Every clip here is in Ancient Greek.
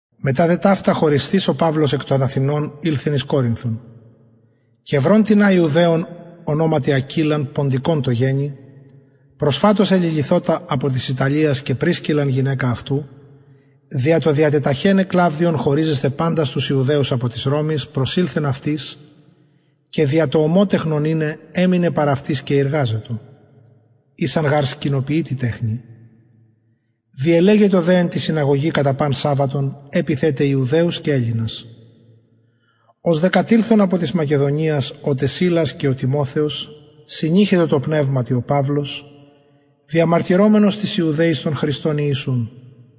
μετα δε ταυτα χωρισθεις ο παυλος εκ των αθηνων ηλθεν εις κορινθον και ευρων τινα ιουδαιον ονοματι ακυλαν ποντικον τω γενει προσφατως εληλυθοτα απο της ιταλιας και πρισκιλλαν γυναικα αυτου δια το τεταχεναι κλαυδιον χωριζεσθαι παντας τους ιουδαιους εκ της ρωμης προσηλθεν αυτοις και δια το ομοτεχνον ειναι εμενεν παρ αυτοις και ειργαζετο ησαν γαρ σκηνοποιοι την τεχνην διελεγετο δε εν τη συναγωγη κατα παν σαββατον επειθεν τε ιουδαιους και ελληνας ως δε κατηλθον απο της μακεδονιας ο τε σιλας και ο τιμοθεος συνειχετο τω πνευματι ο παυλος διαμαρτυρομενος τοις ιουδαιοις τον χριστον ιησουν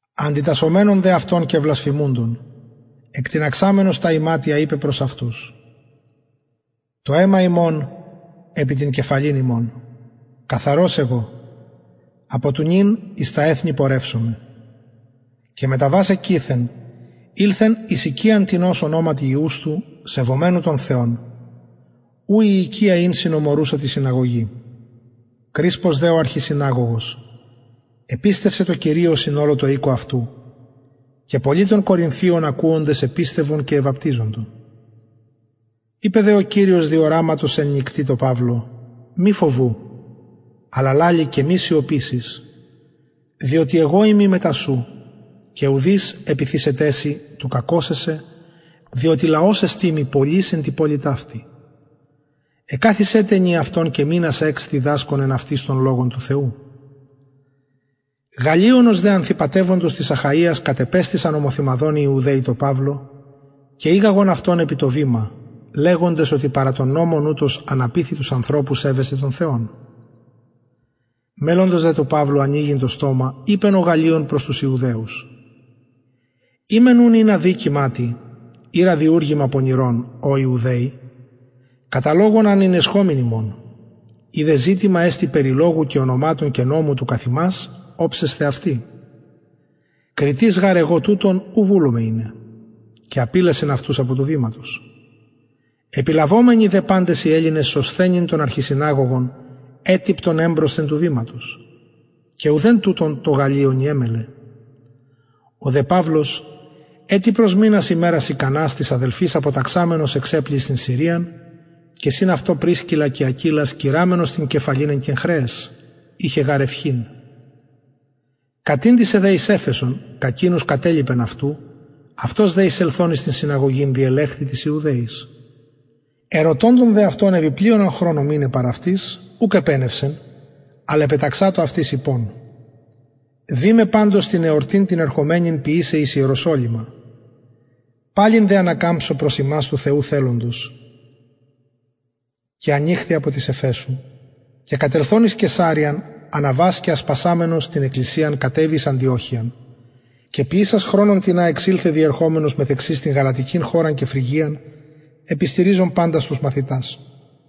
αντιτασσομενων δε αυτων και βλασφημουντων εκτιναξαμενος τα ιματια ειπεν προς αυτους το αιμα υμων επι την κεφαλην υμων καθαρος εγω απο του νυν εις τα εθνη πορευσομαι και μεταβας εκειθεν ηλθεν εις οικιαν τινος ονοματι ιουστου σεβομενου τον θεον ου η οικια ην συνομορουσα τη συναγωγη κρισπος δε ο αρχισυναγωγος επιστευσεν τω κυριω συν ολω τω οικω αυτου και πολλοι των κορινθιων ακουοντες επιστευον και εβαπτιζοντο ειπεν δε ο κυριος δι οραματος εν νυκτι τω παυλω μη φοβου αλλα λαλει και μη σιωπησης διοτι εγω ειμι μετα σου και ουδεις επιθησεται σοι του κακωσαι σε διοτι λαος εστιν μοι πολυς εν τη πολει ταυτη εκαθισεν τε ενιαυτον και μηνας εξ διδασκων εν αυτοις τον λογον του θεου γαλλιωνος δε ανθυπατευοντος της αχαιας κατεπεστησαν ομοθυμαδον οι ιουδαιοι τω παυλω και ηγαγον αυτον επι το βημα λεγοντες οτι παρα τον νομον ουτος αναπειθει τους ανθρωπους σεβεσθαι τον θεον μελλοντος δε του παυλου ανοιγειν το στομα ειπεν ο γαλλιων προς τους ιουδαιους ει μεν ουν ην αδικημα τι η ραδιουργημα πονηρον ω ιουδαιοι κατα λογον αν ηνεσχομην υμων ει δε ζητημα εστιν περι λογου και ονοματων και νομου του καθ υμας οψεσθε αυτοι κριτης γαρ εγω τουτων ου βουλομαι ειναι και απηλασεν αυτους απο του βηματος επιλαβομενοι δε παντες οι ελληνες σωσθενην τον αρχισυναγωγον ετυπτον εμπροσθεν του βηματος και ουδεν τουτων τω γαλλιωνι εμελλεν ο δε παυλος ετι προσμεινας ημερας ικανας τοις αδελφοις αποταξαμενος εξεπλει εις την συριαν και συν αυτω πρισκιλλα και ακυλας κειραμενος την κεφαλην εν κεγχρεαις ειχεν γαρ ευχην κατηντησεν δε εις εφεσον και εκεινους κατελιπεν αυτου αυτος δε εισελθων εις την συναγωγην διελεχθη τοις ιουδαιοις ερωτωντων δε αυτων επι πλειονα χρονον μειναι παρ αυτοις ουκ επενευσεν αλλ απεταξατο αυτοις ειπων δει με παντως την εορτην την ερχομενην ποιησαι εις ιεροσολυμα παλιν δε ανακαμψω προς υμας του θεου θελοντος ανηχθη απο της εφεσου και κατελθων εις καισαρειαν αναβας και ασπασαμενος την εκκλησιαν κατεβη εις αντιοχειαν και ποιησας χρονον τινα εξηλθεν διερχομενος καθεξης την γαλατικην χωραν και φρυγιαν επιστηριζων παντας τους μαθητας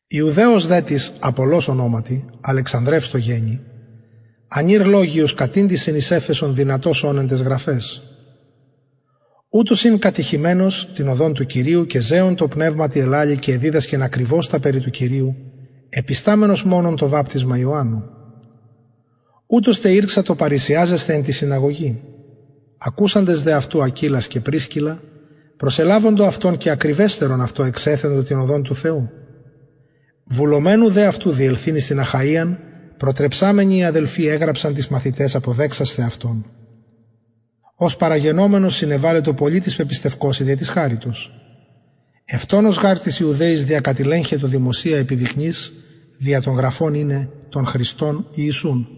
ιουδαιος δε τις απολλως ονοματι αλεξανδρευς τω γενει ανηρ λογιος κατηντησεν εις εφεσον δυνατος ων εν ταις γραφαις ουτος ην κατηχημενος την οδον του κυριου και ζεων τω πνευματι ελαλει και εδιδασκεν ακριβως τα περι του κυριου επισταμενος μονον το βαπτισμα ιωαννου ουτος τε ηρξατο παρρησιαζεσθαι εν τη συναγωγη ακουσαντες δε αυτου ακυλας και πρισκιλλα προσελαβοντο αυτον και ακριβεστερον αυτω εξεθεντο την του θεου οδον βουλομενου δε αυτου διελθειν εις την αχαιαν προτρεψαμενοι οι αδελφοι εγραψαν τοις μαθηταις αποδεξασθαι αυτον ος παραγενομενος συνεβαλετο πολυ τοις πεπιστευκοσιν δια της χαριτος ευτονως γαρ τοις ιουδαιοις διακατηλεγχετο δημοσια επιδεικνυς δια των γραφων ειναι τον χριστον ιησουν